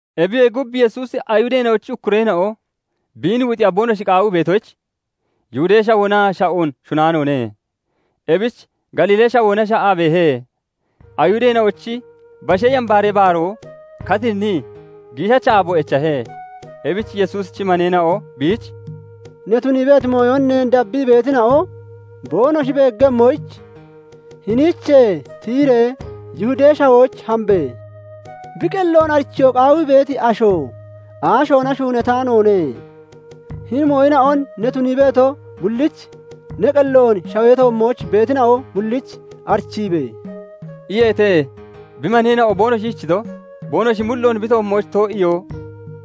Ebiyee gub, Yesuusi Ayihudeena'ochi ukkureena'o biin wuxiya boonoshi qaawii beetoyich, Yihudee Shawoona sha'oon shunnaanoone; ebich Galiilee Shawoona sha'aa beehe. Ayihudeena'ochi Bashee Yambaaree Baaroo katinnii giishacha aabo echahe. Ebich Yesuusichi maneena'o biich "Ne tunii beeti mooyon neen dabbii beetina'o boonoshi beeggemmoyich, hiniichee tiyiree Yihudee Shawooch hambe! Bi qelloon arichiyoo qaawii beeti asho aashoona shuunataanoone. Hini mooyina'on ne tunii beeto bullich, ne qelloon shawee toommooch beetina'o bullich arichiibe!" iyeete. Bi maneena'o boonoshi ishichito, boonoshi mulloon bi toommooch too'iyoo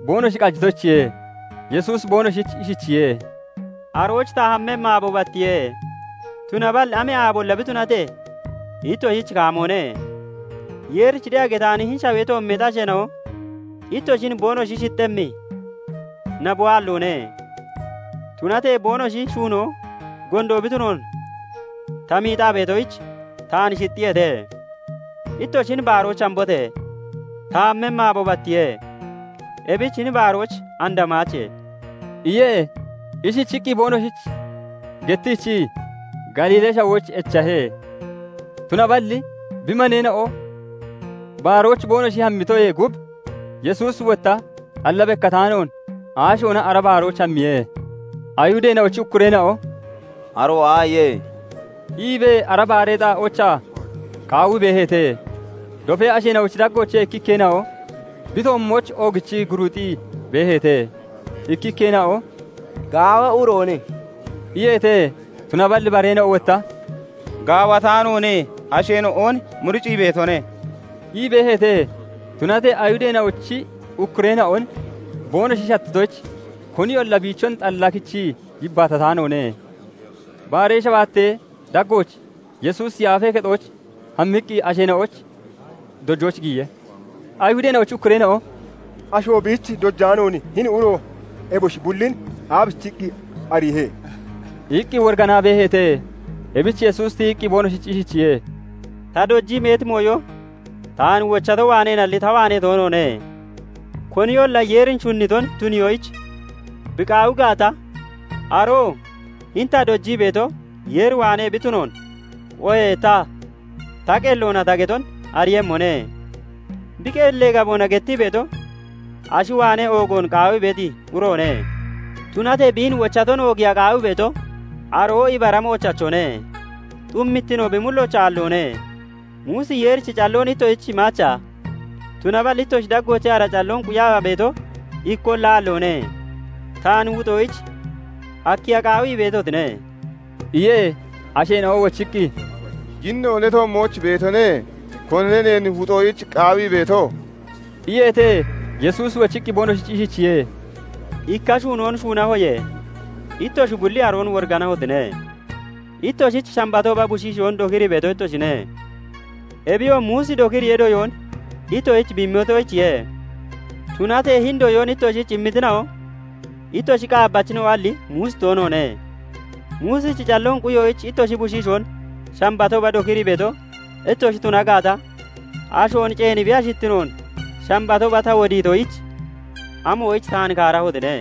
boonoshi qajitoyichiye. Yesuusi boonoshich ishichiye:- "Arooch ta hammemmi aabo battiye; tunaballi amee aabolla bi tunatee, ittoshich kaamoone. Yeerich de'a getaani hini shawee toommeexi asheena'o ittoshin boonoshi shixxemmi naboo aalloone; tunatee boonoshi shuunoo gondo bi tunoon ta miixaa beetoyich, taan shixxiyeete. Ittoshi hini baarooch hambote! Ta hammemmi aabo battiye. Ebich hini baarooch and hamaache" iye. Ishichiqqi boonoshich gettiichii Galiilee Shawooch echahe. Tunaballi bi maneena'o baarooch boonoshi hammitoyee gub, Yesuusi wotta xalla bekkataanoon aashoona ara baarooch hammiye. Ayihudeena'ochi ukkureena'o "aroo aaye?" iibee ara baaree xaa'oochaa qaawii beeheete. Dofee asheena'ochi daggoochee ikkikkeena'o bi toommooch oogichii guruuxii beeheete. Ikkikkeena'o "Gaawa uroone" iyeete; tunaballi bareena'o wotta "Gaawataanoone; asheena'on muricii beetone" ii beeheete. Tunatee Ayihudeena'ochi ukkureena'on boonoshi shattitoyich, koniyolla biichon xalla kichii yibbaatataanoone. Baaree shabaattee daggooch Yesuusi Yaafee Kexooch hammiqqi asheena'oyich dojooch giyiye. Ayihudeena'ochi ukkureena'o "Asho biich dojaanoon, hini uro eboshi bullin aabichiqqi ariihe?" iqqi woriganaa beeheete. Ebich Yesuusi tiyiqqi boonoshich ishichiye:- "Ta dojii beeti mooyo taan wochato waaneenalli ta waanee toonoone. Koniyolla Yeeri shunniton tuniyoyich bi qaawi gaata, aroo hini ta dojii beeto Yeer waanee bi tunoon oohee ta, ta qelloona ta geton ariiyemmone. Bi qellee gaboona gettii beeto, ashi waanee oogoon qaawii beeti uroone; tunatee biin wochaton oogiiya qaawii beeto, aroo ibara moochachone; xummittino bi mullooch aalloone. Muusi Yeerichi calloon ittoshich imaacha? Tunaballi ittoshi daggoochee ara calloon quyaa beeto ikkolla aalloone. Taan wuxoyich akkiya qaawii beetotine?" iye. Asheena'o wochiqqi, "Yinno ne toommooch beetone. Konine neen wuxoyich qaawii beeto?" iyeete. Yesuusi wochiqqi boonoshich ishichiye:- "Ikka shuunoon shuunahoye; ittoshi bulli aroon woriganahotine. Ittoshich, Shambatooba bushiishoon dokirii beeto ittoshine. Ebiyoo Muusi dokiriyee doyoon ittoshich bi immitoyichiye; tunatee hini doyoon ittoshich immitina'o, ittoshi qaabbachina'oalli Muusi toonoone. Muusichi calloon quyoyich ittoshi bushiishoon Shambatooba dokirii beeto ittoshi tuna gaata, ashoon ceeni bi ashittinoon Shambatooba ta wodiitoyich, amoyich taan kaarahotine?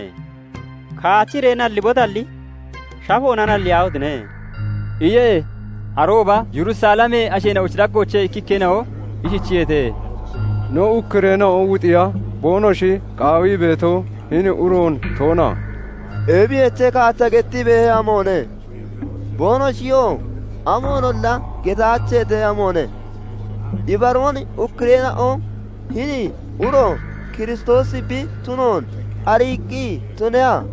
Kaachiree nallibotalli shafoona nalliyaahotine!" iye. Arooba Yerusalemee asheena'ochi daggoochee ikkikkeena'o ishichiyeete:- "No ukkureena'o wuxiya boonoshi qaawii beeto, hini uroon toona? Ebiyoche! Kaacha gettii beehe amoone! Boonoshiyoo amoonolla getaacheete amoone! Ibaroon ukkureena'o hini uro Kiristoosi bi tunoon ariiqqi tuneha?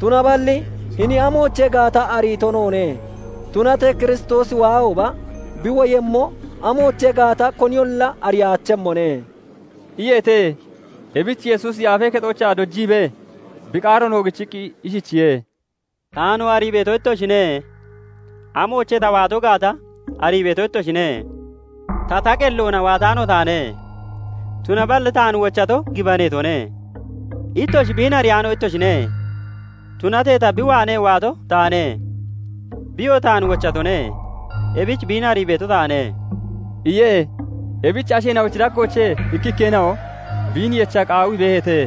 Tunaballi hini amoochee gaata ariito noone; tunatee Kiristoosi waahooba, bi woyemmo amoochee gaata koniyolla ariyaachemmone" iyeete. Ebich Yesuusi Yaafee Kexoochaa dojiibee bi qaaroon oogichiqqi ishichiye:- "Taanoo arii beeto ittoshine; amoochee ta waato gaata arii beeto ittoshine. Ta, ta qelloona waataano taane; tunaballi taan wochato gibaneetone; ittoshi biin ariyaano ittoshine; Tunatee ta bi waanee waato taane; biyoo taan wochatone; ebich biin arii beeto taane" iye. Ebich asheena'ochi daggoochee ikkikkeena'o biin yecha qaawii beeheete;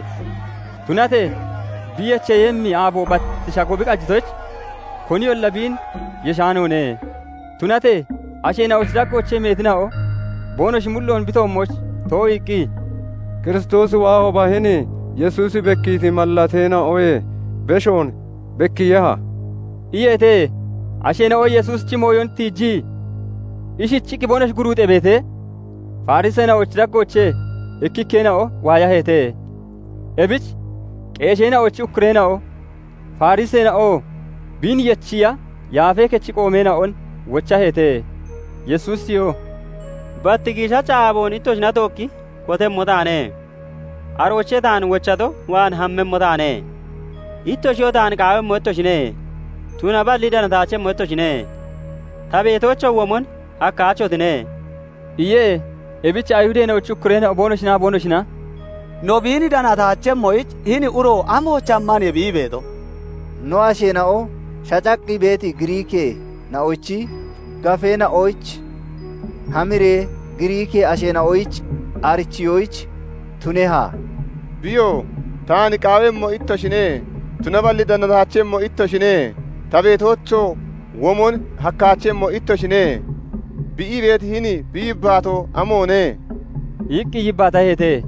tunatee bi yecheeyemmi aabo bat shago bi qajitoyich koniyolla biin yeshaanoone. Tunatee asheena'ochi daggoochee meetina'o boonoshi mulloon bi toommooch too'iiqqi, "Kiristoosi waahooba, hini Yesuusi bekkiiti mallateena'oyee beshoon bekkiiyeha?" iyeete. Asheena'o Yesuusichi mooyon tiijii ishichiqqi boonoshi guruuxee beetee, Fariseena'ochi daggoochee ikkikkeena'o waayaheete. Ebich qeesheena'ochi ukkureena'o, Fariseena'oo biin yechiiya Yaafee Kechi qoomeena'on wochaheete. Yesuusiyoo "Bat giishacha aaboon ittoshina tookki kotemmo taane; aroochee taan wochato waan hammemmo taane. Ittoshiyoo taan qaawemmo ittoshine; tunaballi danataachemmo ittoshine; ta beetoochoo womon hakkaachotine" iye. Ebich Ayihudeena'ochi ukkureena'o boonoshinaa boonoshina "No biin danataachemmoyich, hini uro amooch hammaniye bi ii beeto? No asheena'o shacaqqi beeti Giriikkeena'ochi gafeena'ooch hamiree Giriikkee asheena'oyich arichiyoyich tuneha? Biyoo 'Taan qaawemmo ittoshine; tunaballi danataachemmo ittoshine; ta beetoochoo womon hakkaachemmo ittoshine' bi ii beeti hini bi yibbaatoo amoone?" iqqi yibbaataheete.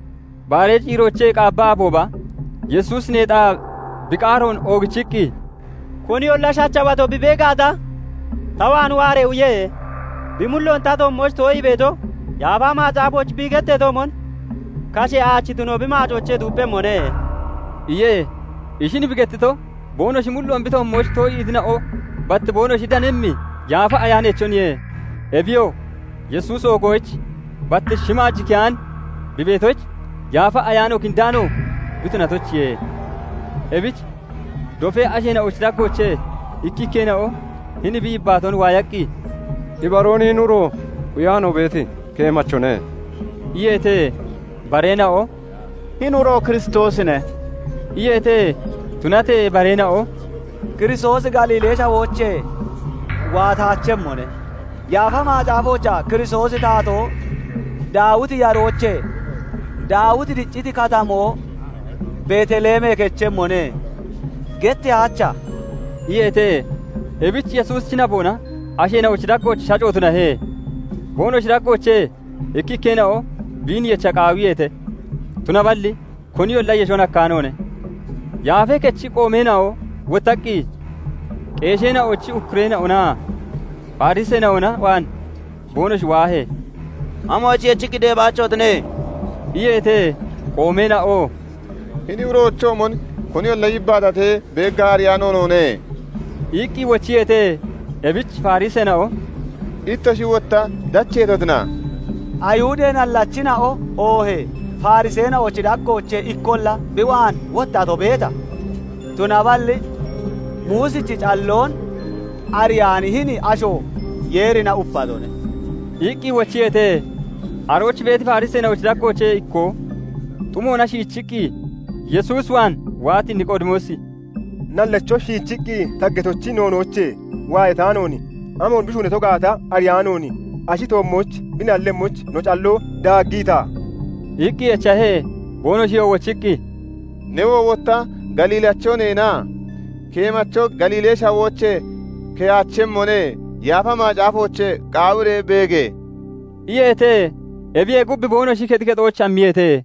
Baaree ciiroochee qaabba aabooba Yesuusi neexaa bi qaaroon oogichiqqi, "Koniyolla shachawato bi bee gaata, ta waan waaree uye. Bi mulloon ta toommooch too'ii beeto, Yaafa Macaafoochaa bi getteetoomon, 'Kashee aachi tunoo bi maacoochee xuupphemmone' "iye. Ishin bi gettito, boonoshi mulloon bi toommooch too'iitina'o bat boonoshi danemmi Yaafa Ayaaneechoniye; ebiyoo Yesuusi oogoyich bat shimaaj keyaan bi beetoyich, Yaafa Ayaano kindaano bi tunatoyichiye. Ebich dofee asheena'ochi daggoochee ikkikkeena'o hini bi yibbaatoon waayaqqi, "Ibaroon hini uro quyaa no beeti keemachone" iyeete. Bareena'o "Hini uro Kiristoosine" iyeete. Tunatee bareena'o "Kiristoosi Galiilee Shawoochee waataachemmone. Yaafa Macaafoochaa 'Kiristoosi Taatoo Daawiti yaroochee, Daawiti dicciti katamoo Betelemee kechemmone' getteyaacha?" iyeete. Ebich Yesuusichi naboona asheena'ochi daggooch shaaco tunahe; Boonoshi daggoochee ikkikkeena'o biin yecha qaawiyeete; tunaballi koniyolla yeshon hakkaanoone. Yaafee Kechi qoomeena'o wottaqqi qeesheena'ochi ukkureena'onaa Fariseena'ona waan boonoshi waahee, "Amoyich yechiqqi deebaachotine?" iyeete. Qoomeena'oo "Hini uroochoomon koniyolla yibbaatatee beeggaa ariyaano noone" iqqi wochiyeete. Ebich Fariseena'o "Ittoshi wotta dacheetotina? Ayihudee nallachina'o oohee Fariseena'ochi daggoochee ikkolla bi waan wottato beeta? Tunaballi Muusichi calloon ariyaani hini asho Yeerina upatone" iqqi wochiyeete. Arooch beeti Fariseena'ochi daggoochee ikkoo xumoona shiichiqqi Yesuus waan waati Niqoodimoosi "Nallacho shiichiqqi taggeetochi noonoochee waayataanoon, amoon bi shuunato gaata ariyaanoon, ashi toommooch bi nallemmoyich no calloo daaggiita?" iqqi echahe. Boonoshiyoo wochiqqi, "Newoo wotta Galiilacho neena? Keemacho Galiilee Shawoochee keyaachemmone. Yaafa Macaafoochee qaawiree beege!" iyeete. [ebiyee gub, boonoshi kexi kexooch hammiyeete.